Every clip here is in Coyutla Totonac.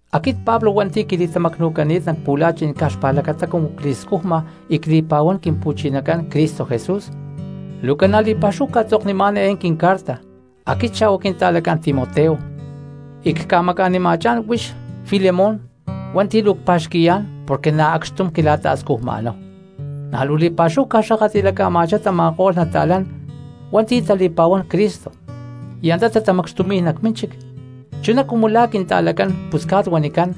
Aquit Pablo hua̠nti̠ quili̠tamacnu̠cani̠t nac pu̠la̠chi̠n caj xpa̠lacata cumu cli̠scujma y cli̠pa̠huán Quimpu̠chinacán Cristo Jesús, luu ca̠na li̠pa̠xúhu ctzoknimá̠n eé quincarta, aquit xa̠hua quinta̠lacán Timoteo, y cca̠maca̠nima̠chá̠n huix Filemón hua̠nti̠ luu cpa̠xqui̠yá̠n porque na̠ acxtum quila̠ta̠scujma̠náhu. Na̠ luu li̠pa̠xúhu cca̠xakatli̠laca̠ma̠chá tama̠ko̠lh cristianos hua̠nti̠ tali̠pa̠huán Cristo y antá tatamacxtumi̠y nac mínchic, chuná cumu la̠ quinta̠lacán pusca̠t huanicán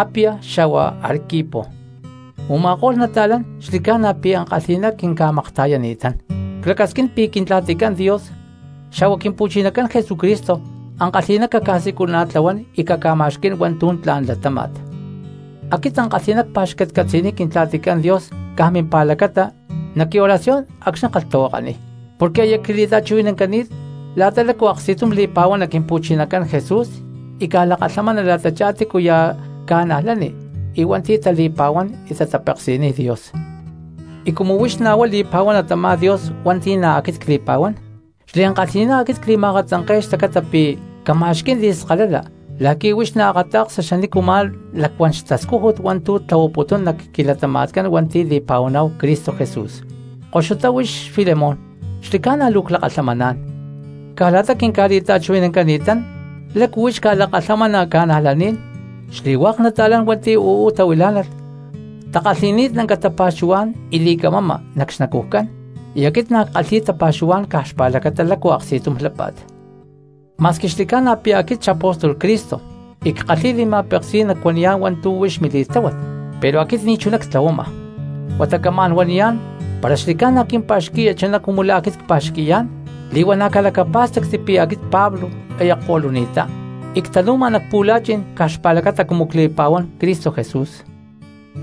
Apia xa̠hua Arquipo, u̠ma̠ko̠lh nata̠lán xli̠ca̠na pi̠ ankalhi̠ná quinca̠makta̠yani̠tán. Clacasquín pi̠ Quintla̠ticán Dios xa̠hua Quimpu̠chinacán Jesucristo ankalhi̠ná caca̠siculana̠tlahuán y caca̠ma̠xquí̠n hua̠ntu̠ tla̠n latáma̠t. Aquit ankalhi̠ná cpa̠xcatcatzi̠niy Quintla̠ticán Dios caj mimpa̠lacata nac quioración acxni̠ ckalhtahuakaniy, porque aya quili̠ta̠chuhui̠nancani̠t la̠ta lácu aksti̠tum li̠pa̠huana Quimpu̠chinacán Jesús y ca̠lakalhamana la̠tachá tícuya̠ cristiano y hua̠nti̠ tali̠pa̠huán y tatapeksi̠niy Dios. Y cumu huix na̠ huá li̠pa̠huana tamá Dios hua̠nti̠ na̠ aquit cli̠pa̠huán, xliankalhi̠ná aquit cli̠ma̠akatzanke̠y xlacata pi̠ cama̠xquí̠n li̠skalala la̠qui̠ huix naakata̠ksa xanícu ma̠ lacuán xtascújut hua̠ntu̠ xtlahuaputún nac quilatama̠tcán hua̠nti̠ li̠pa̠huaná̠hu Cristo Jesús. Koxutá huix Filemón, xli̠ca̠na luu clakalhamaná̠n, caj la̠ta quinca̠li̠ta̠chuhui̠nancani̠tán lácu huix ca̠lakalhamana cristianos, xli̠hua̠k nata̠lán hua̠nti̠ uú tahuilá̠nalh takalhi̠ni̠t lanca tapa̠xuhuá̠n y li̠camama nac xnacujcán y aquit na̠ ckalhi̠y tapa̠xuhuá̠n caj xpa̠lacata lácu aksti̠tum lápa̠t. Ma̠squi xli̠ca̠na pi̠ aquit xapóstol Cristo y ckalhi̠y li̠ma̠peksí̠n nacuaniyá̠n hua̠ntu̠ huix mili̠tláhuat, pero aquit ni̠chuná ctlahuama, huata camá̠n huaniyá̠n para xli̠ca̠na quimpa̠xqui̠ya chuná cumu la̠ aquit cpa̠xqui̠yá̠n li̠huana̠ calacapá̠stacti pi̠ aquit Pablo aya cko̠luni̠ttá y ctanu̠ma nac pu̠la̠chi̠n caj xpa̠lacata cumu cli̠pa̠huán Cristo Jesús.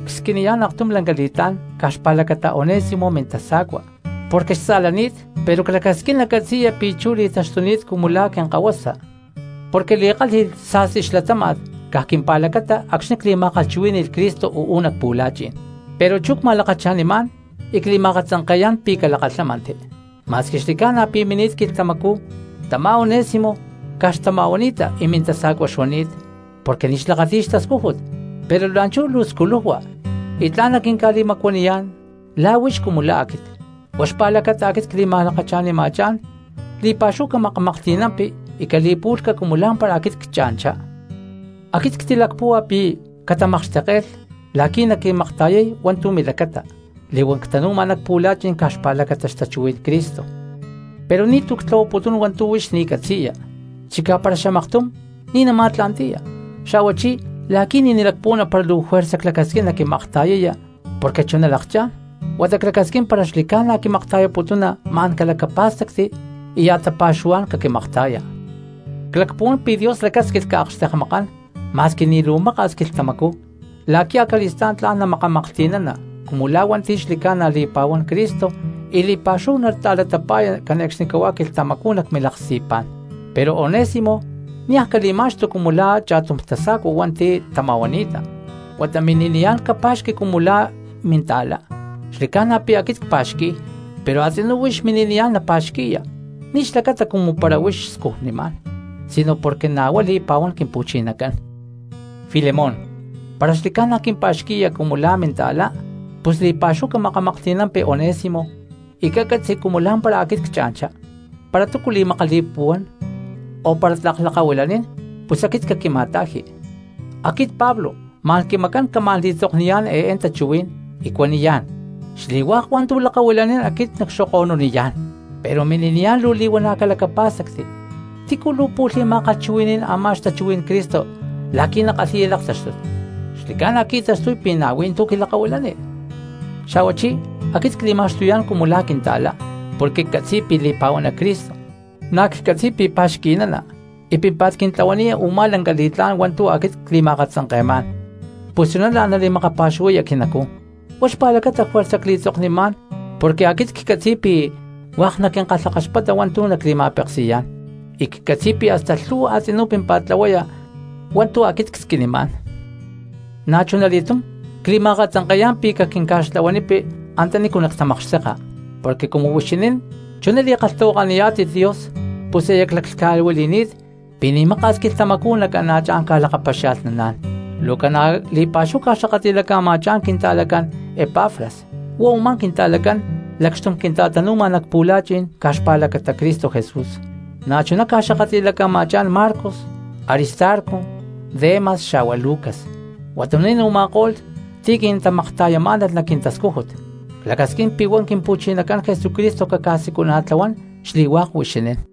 Csquiniyá̠n aktum lanca li̠tlá̠n caj xpa̠lacata Onésimo mintasa̠cua pero xtza̠lani̠t porque clacasquín nacatzi̠ya pi̠ chú li̠taxtuni̠t cumu la̠ quinkahuasa porque li̠kálhi̠lh sa̠sti xlatáma̠t caj quimpa̠lacata acxni̠ cli̠ma̠kalhchuhuí̠ni̠lh Cristo uú nac pu̠la̠chi̠n, pero chú cma̠lakacha̠nimá̠n y cli̠ma̠akatzanke̠yá̠n pi̠ calakalhámanti. Ma̠squi xli̠ca̠na pi̠ mini̠t quilhtamacú tamá Onésimo caj xtama̠huani̠ta y mintasa̠cua xuani̠t porque ni̠ xlakati̠y xtascújut, pero la̠nchú luu sculujua y tla̠n naquinca̠li̠macuaniyá̠n la̠ huix cumu la̠ aquit. Huá xpa̠lacata aquit cli̠ma̠lakacha̠nima̠chá̠n; li̠pa̠xúhu camakamaklhti̠nampi y cali̠pu̠lhca cumu lá̠mpara aquit ccha̠nchá. Aquit ctilacpúhua pi̠ catamakxtekke̠lh la̠qui̠ naquimakta̠yay hua̠ntu̠ milacata li̠huán ctanu̠ma nac pu̠la̠chi̠n caj xpa̠lacata xtachuhuí̠n Cristo. Pero ni̠tu̠ ctlahuaputún hua̠ntu̠ huix ni̠ catzi̠ya, chicá para xamaktum ni̠ nama̠tla̠nti̠ya, xa̠huachí la̠qui̠ ni̠ nalacpuhuana para luu juerza clacasquín naquimakta̠yaya porque chuná lakchá̠n, huata clacasquín para xli̠ca̠na quimakta̠yaputuna ma̠n calacapá̠stacti y ya̠ tapa̠xuhuá̠n caquimakta̠ya. Clacpuhuán pi̠ Dios lacásquilh caakxtekmákalh ma̠squi ni̠ luu maka̠s quilhtamacú la̠qui̠ acali̠stá̠n tla̠n namakamaklhti̠nana cumu hua̠nti̠ na̠ xli̠ca̠na li̠pa̠huán Cristo y li̠pa̠xúhu nata̠latapa̠ya cane̠cxnicahuá quilhtamacú nac milaksti̠pá̠n. Pero Onésimo niaj cali̠ma̠xtu cumu la̠ cha̠tum tasa̠cua hua̠nti̠ tama̠huani̠ta, huata mini̠niyá̠n capa̠xqui cumu la̠ minta̠lá. Xli̠ca̠na pi̠ aquit cpa̠xqui̠y, pero a̠tzinú huix mini̠niyá̠n napa̠xqui̠ya, ni̠ xlacata cumu para huix scujnimá̠n sino porque na̠ huá li̠pa̠huán Quimpu̠chinacán. Filemón, para xli̠ca̠na quimpa̠xqui̠ya cumu la̠ minta̠la pus li̠pa̠xúhu camakamaklhti̠nampi Onésimo, y cacatzi cumu lá̠mpara aquit cha̠nchá. Para túcu li̠makali̠puhuán o para tlak lakahuilanín pus aquit caquima̠ta̠ji. Aquit Pablo ma̠n quimacán ca̠macán camá̠n li̠tzokniyá̠n eé tachuhuí̠n y cuaniyá̠n: ¡Xli̠hua̠k hua̠ntu̠ xlakahuilanín aquit nacxokoniyá̠n! Pero mini̠niyá̠n luu li̠huana̠ calacapá̠stacti, ¿tícu luu pu̠lh li̠ma̠kalhchuhui̠ní̠n amá xtachuhuí̠n Cristo la̠qui̠ nakalhi̠ya laktáxtut? Xli̠ca̠na qui̠taxtuy pi̠ na̠ hui̠ntú quilakahuilani. Xa̠huachí aquit cli̠ma̠xtuyá̠n cumu la̠ quinta̠lá porque ccatzi̠y pi̠ li̠pa̠huana Cristo, na̠ ccatzi̠y pi̠ pa̠xqui̠nana y pímpa̠t quintlahuaniya u̠má lanca li̠tlá̠n hua̠ntu̠ aquit cli̠ma̠akatzanke̠má̠n, pus chuná la̠n nali̠makapa̠xuhuaya quinacú. Huá xpa̠lacata juerza cli̠tzoknimá̠n porque aquit ccatzi̠y pi̠ hua̠k naquinkalhakaxpata hua̠ntu̠ nacli̠ma̠peksi̠yá̠n, y ccatzi̠y pi̠ hasta lhu̠hua a̠tzinú pímpa̠t tlahuaya hua̠ntu̠ aquit csquinimá̠n. Na̠chunali̠túm cli̠ma̠akatzanke̠yá̠n pi̠ caquinca̠xtlahuanipi antanícu nactamakxteka, porque cumu huixinín chuná li̠kalhtahuakaniyá̠tit Dios, pus aya claclhca̠huili̠ni̠t pi̠ ni̠ maka̠s quilhtamacú nacana̠chá̠n ca̠lakapaxia̠lhnaná̠n. Luu ca̠na li̠pa̠xúhu ca̠xakatli̠laca̠ma̠chá̠n quinta̠lacán Epafras, huá u̠má quinta̠lacán lacxtum quinta̠tanu̠ma nac pu̠la̠chi̠n caj xpa̠lacata Cristo Jesús. Na̠chuná ca̠xakatli̠laca̠ma̠chá̠n Marcos, Aristarco, Demas xa̠hua Lucas, huatuní̠n u̠ma̠ko̠lh ti̠ quintamakta̠yamá̠nalh nac quintascújut. Clacasquín pi̠ huá Quimpu̠chinacán Jesucristo caca̠siculana̠tlahuán xli̠hua̠k huixinín.